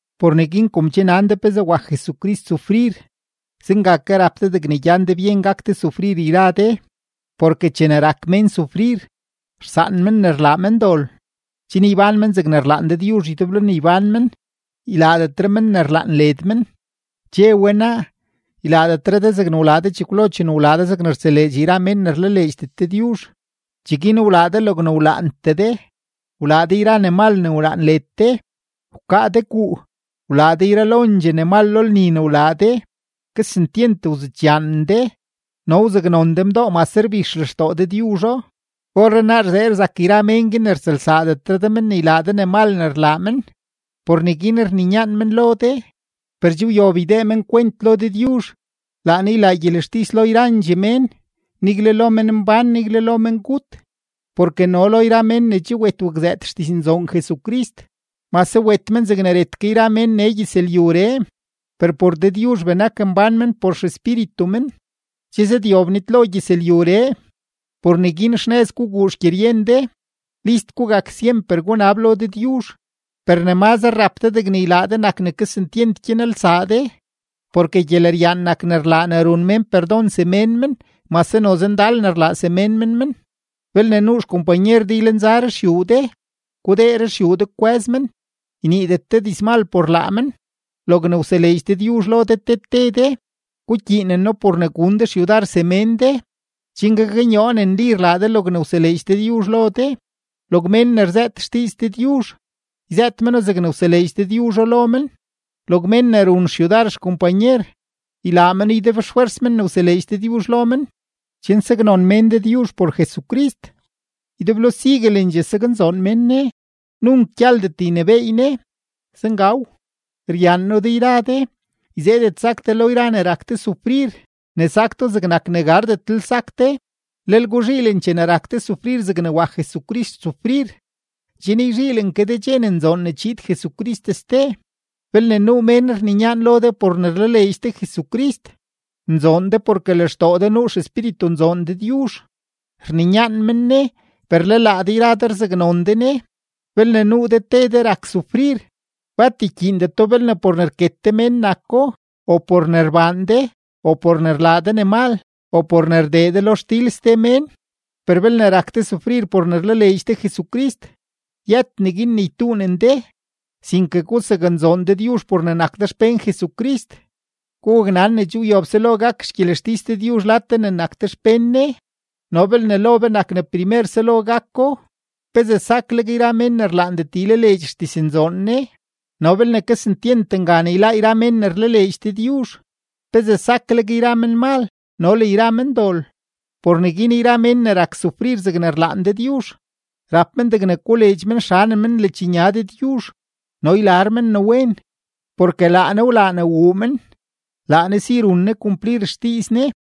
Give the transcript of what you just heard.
Por neguin kom che nan de pezee wak Jesucrist sufrir, zenga ke rap de degne gyan de byen gak de sufrir yra de, porke chene rak mén sufrir, rsaan men ne rlaa men dol, chen ybán men zegne rlaan Dëdyuzh ydeblo ne ybán men, ylaadetre men ne rlaan led men. Che we naa, ylaadetre de zegne wlaa de chekwlo chene wlaa de zegne rtseleedx yra mén ne rlaleedxdet Dëdyuzh. Cheguin wlaa de logne wlaantee de, wlaa de yra ne mal ne wlaan led de, wkaa de guu, wlaa de yralondxee ne mal lo lni ne wlaa de, kesentyent wzudxyaanen de, no wzaknon de mdoo mase rbix lextoo Dëdyuzho. Orrenaa rzee rzak yra mén guin ne rtsëlsaadetre de men ne ylaa de mal ne rlaa men; por neguin rninyaan men lo de. Per che wyob ydee men kwent lo Dëdyuzh; laa Ne ylaa gyelextis lo yrandxee mén, nigle lo menmbán, nigle lo mengut. Porke no lo yra mén ne che wet wakzëët xdiznzoon Jesucrist. Mase wet men zegne ret ke yra mén nee gyëzlyuree, per por Dëdyuzh benak mbán men por xespíritu men. Che zëdyob nitlo gyëzlyuree. Por neguin xnëz guguu xgyeryen de; list gugak syemper gunab lo Dëdyuzh. Per ne mazre rap de degne ylaa de nak ne kesentyent gyanelsaa de, porke gyeleryaan nak ne rlaa ne run mén perdon semén men mase noze ndal ne rlaa semén men men. Belne nuu xkompanyer de ylenza ruxyuu de, gudee ruxyuu de kwë́z men, yniidet de dizmal por laa men. Logne wseleedx Dëdyuzh lo de te te de, gukyiineno por ne gun de xyudar semén de, chen gaknyoo ne nli rlaa de logne wseleedx Dëdyuzh lo de. Log mén ne rzëët xdiiz Dëdyuzh, yzëët meno zegne wseleedx Dëdyuzho lo men. Log mén ne run xyudar xkompanyer, ylaa meno ydeblofwers ne wseleedx Dëdyuzh lo men, chen saknon mén Dëdyuzh por Jesucrist. Ydeblo siguelendxee saknzoon mén Ne. Nunk gyaldet ynebééy Ne. Zengaw. Ryaan noo de yra de; yzeedet sak de lo yra ne rak de sufrir, ne sak do zegnak ne gardetlel sak de. Lel guzhiilen chene rak de sufrir zegne wak Jesucrist sufrir, chen yzhiilen ke de dxe ne nzoon ne chiid Jesucrist ste. Belne nuu mén rninyaan lo de por ne rlaleedx de Jesucrist, nzoon de porke lextoo de nuu XEspíritunzoon Dëdyuzh. Rninyaan men Ne, per le laa de rzaknon de Ne. Belne nuu de te de rak sufrir, bat ykyiindeto belne por ne rket de mén nako, o por ne rbaan de, o por ne rlaa de ne mal, o por ne rdee de lo xdil ste mén; per belne rak de sufrir por ne rlaleedx de Jesucrist, yët neguin ne ytuunen de, sinke gusaknzoon Dëdyuzh por ne nak de xpén Jesucrist. Gugaknan ne che wyob selo gak xgyelextis Dëdyuzh lad be ne nak be xpén Ne. No belne lo be nak ne primer selo gako, ¿pezee sakleg yra mén ne rlaandet ylaleedx xdiznzoon Ne? No belne kesentyent ngan yláá yra mén ne rlaleedx Dëdyuzh, ¿pezee sakleg yra menmal no le yra mendol? Por neguin yra mén ne rak sufrir zegne rlaan Dëdyuzh, rap men degne koleedx men xanem men ledxnya Dëdyuzh no ylar men ne wen, porke laa Ne wlaa ne wuu men; laa Ne si run Ne kumplir xdiiz Ne.